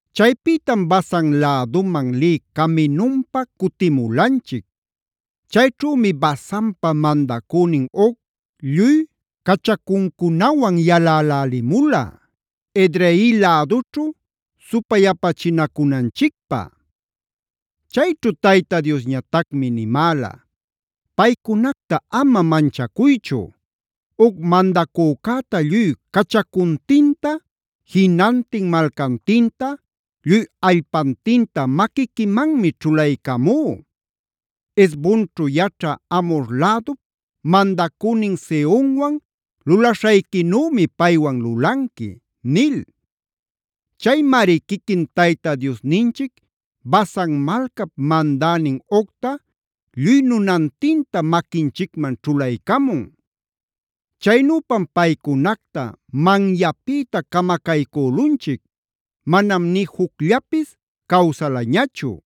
“Chaypïtam Basan läduman lï caminunpa cutimulanchic. Chayćhümi Basanpa mandacünin Og lluy cachacuncunawan yalälälimula Edrei lädućhu supayapachinacunanchicpä. “Chayćhu Tayta Diosñatacmi nimäla: ‘Paycunacta ama manchacuychu. Og mandacücäta lluy cachacuntinta, jinantin malcantinta, lluy allpantinta maquiquimanmi ćhulaycamú. Hesbonćhu yaćhä Amhor lädup mandacünin Sehonwan lulaśhayquinümi paywan lulanqui’ nil. “Chaymari quiquin Tayta Diosninchic Basan malcap mandänin Ogta lluy nunantinta maquinchicman ćhulaycamun. Chaynüpam paycunacta manyapïta camacaycülunchic; manam nï jucllapis cawsalañachu.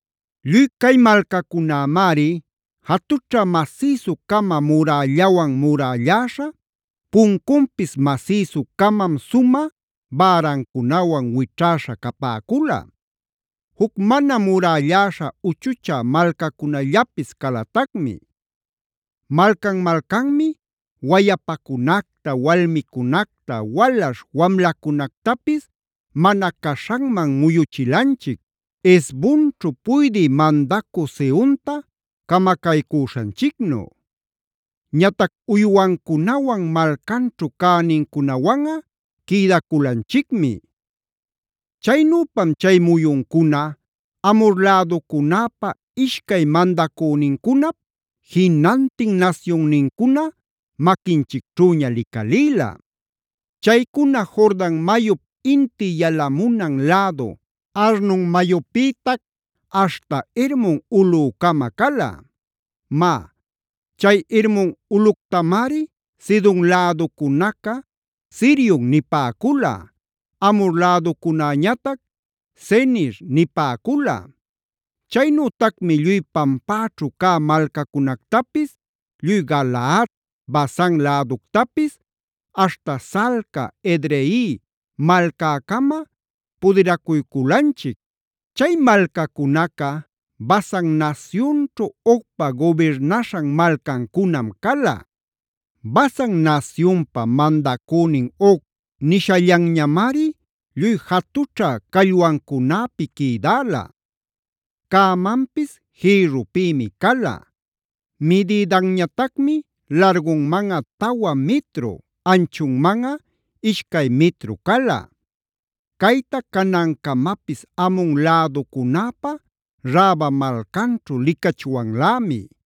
Lluy cay malcacunämari jatućha masïsu-cama murällawan murälläśha, puncunpis masïsucamam sumä bärancunawan wićhäśha capäcula. Juc mana murälläśha uchuchä malcacunallapis calatacmi. Malcan-malcanmi wayapacunacta, walmicunacta, walaśh wamlacunactapis mana caśhanman muyuchilanchic, Hesbonćhu puydï mandacü Sehonta camacaycüśhanchicnu. Ñatac uywancunawan, malcanćhu cänincunawanꞌa quïdaculanchicmi. “Chaynüpam chay muyuncuna Amhor läducunäpa ishcay mandacünincunap jinantin nasyunnincuna maquinchicćhüña licalïla. Chaycuna Jordan mayup inti yalamunan lädu Arnon mayüpïtac aśhta Hermon ulꞌücama cala. Má, chay Hermon ulꞌuctamari Sidon läducunaca Sirion nipäcula, Amhor läducunäñatac Senir nipäcula. Chaynütacmi lluy pampäćhu cä malcacunactapis, lluy Galaad, Basan läductapis aśhta Salca, Edrei malcäcama pudiracuyculanchic. Chay malcacunaca Basan nasyunćhu Ogpa gubirnaśhan malcancunam cala. Basan nasyunpa mandacünin Og nishallanñamari lluy jatućha callwancunäpia quïdäla. Cämanpis jïrrupïmi cala; midïdanñatacmi largunmanꞌa tawa mitru, anchunmanꞌa ishcay mitru cala. Cayta canancamapis Amon läducunäpä Raba malcanćhu licachwanlämi.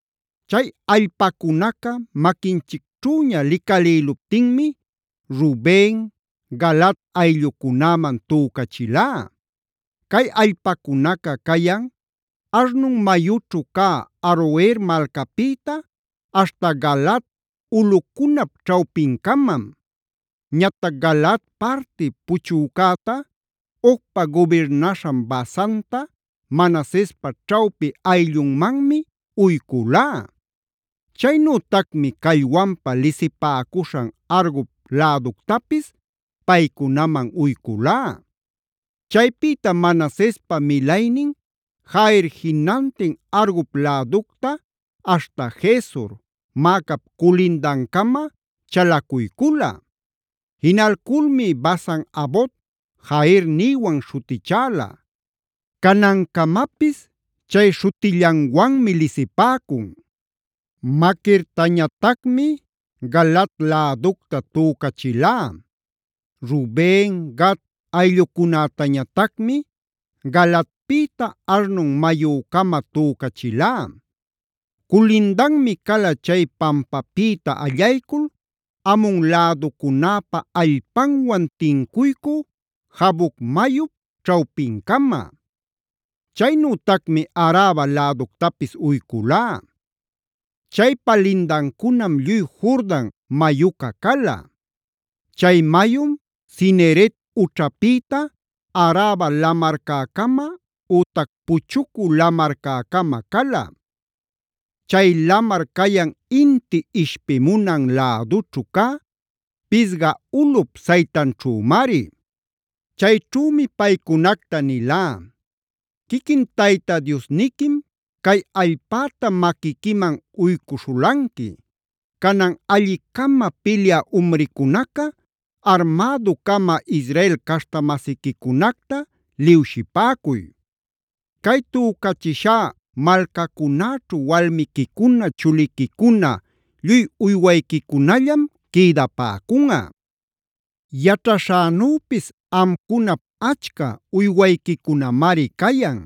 “Chay allpacunaca maquinchicćhüña licälïluptinmi Ruben, Galaad ayllucunäman tücachilá. Cay allpacunaca cayan Arnon mayućhu cä Aroer malcäpïta aśhta Galaad ulꞌucunap ćhawpincamam. Ñatac Galaad parti puchücäta, Ogpa gubirnaśhan Basanta, Manasespa ćhawpi ayllunmanmi uyculá. Chaynütacmi callwanpa lisipäcuśhan Argob läductapis paycunaman uyculá. Chaypïtam Manasespa milaynin Jair jinantin Argob läducta aśhta Gesur, Maacap culindancama chalacuycula. Jinalculmi Basan-havot-jair nïwan śhutichäla; canancamapis chay śhutillanwanmi lisipäcun. Maquirtañatacmib Galaad läducta tücachilá. Ruben, Gad ayllucunätañatacmi Galaadpïta Arnon mayücama tücachilá. Culindanmi cala chay pampapïta allaycul Amon läducunäpa allpanwan tincuycü Jaboc mayup ćhawpincama. Chaynütacmi Araba läductapis uyculá. Chaypa lindancunam lluy Jordan mayuca cala. Chay mayum Cineret ućhapïta Araba lamarcäcama ütac Puchucü Lamarcäcama cala. Chay lamar cayan inti ishpimuna lädućhu cä Pisga ulꞌup saytanćhümari. “Chayćhümi paycunacta nilá: ‘Quiquin Tayta Diosniquim cay allpäta maquiquiman uycuśhulanqui. Canan alli-cama pilyä umricunaca armädu-cama Israel caśhta-masiquicunacta liwshipäcuy. Cay tücachishá malcacunäćhu walmiquicuna, chuliquicuna, lluy uywayquicunallam quïdapäcunꞌa. Yaćhaśhänüpis amcunap achca uywayquicunamari cayan.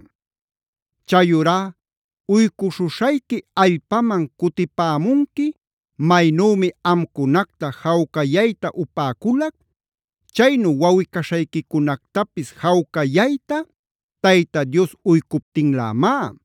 Chayurá uycuśhuśhayqui allpaman cutipämunqui maynümi amcunacta jawcayayta upäculac, chaynu wawꞌi-caśhayquicunactapis jawcayayta Tayta Dios uycuptinlämá;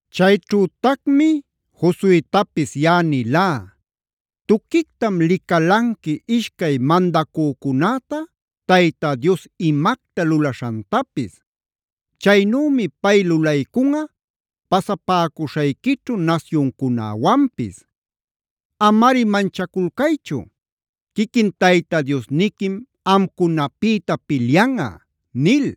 “Chayćhütacmi Josuetapis yaꞌa nilá: ‘Tuquictam licalanqui ishcay mandacücunäta Tayta Dios imacta lulaśhantapis. Chaynümi pay lulaycunꞌa pasapäcuśhayquićhu nasyuncunäwanpis. Amari manchaculcaychu; quiquin Tayta Diosniquim amcunapïta pilyanꞌa’ nil.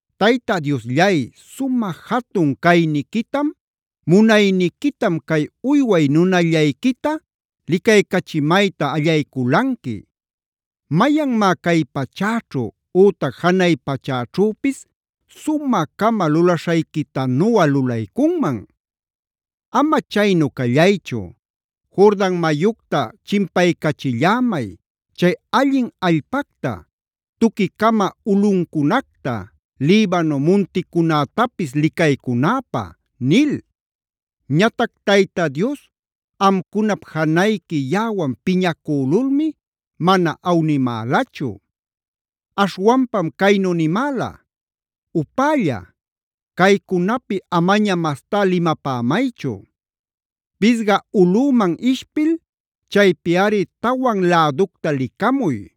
‘Tayta Diosllay sumä jatun cayniquitam, munayniquitam cay uyway nunallayquita licaycachimayta allayculanqui. ¿Mayanmá cay pachäćhu ütac janay pachäćhüpis sumä-cama lulaśhayquitanuꞌa lulaycunman? Ama chaynu callaychu, Jordan mayucta chimpaycachillämay, chay allin allpacta, tuquicama ulꞌuncunacta, Libano munticunätapis licaycunäpä’ nil. Ñatac Tayta Dios amcunap janayqui yaꞌawan piñacülulmi mana awnimälachu. Aśhwanpam caynu nimäla: ‘¡Upälla! Caycunapi amaña mastá limapämaychu. Pisga ulꞌüman ishpil chaypiꞌari tawan läducta licamuy.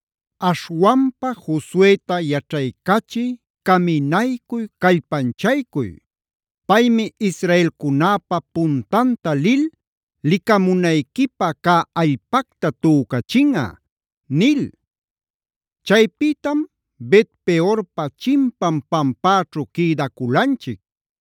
Aśhwanpa Josueta yaćhaycachiy, caminaycuy, callpanchaycuy. Paymi israelcunäpa puntanta lil licamunayquipä cä allpacta tücachinꞌa’ nil. “Chaypïtam Bet-peorpa chimpan pampäćhu quïdaculanchic.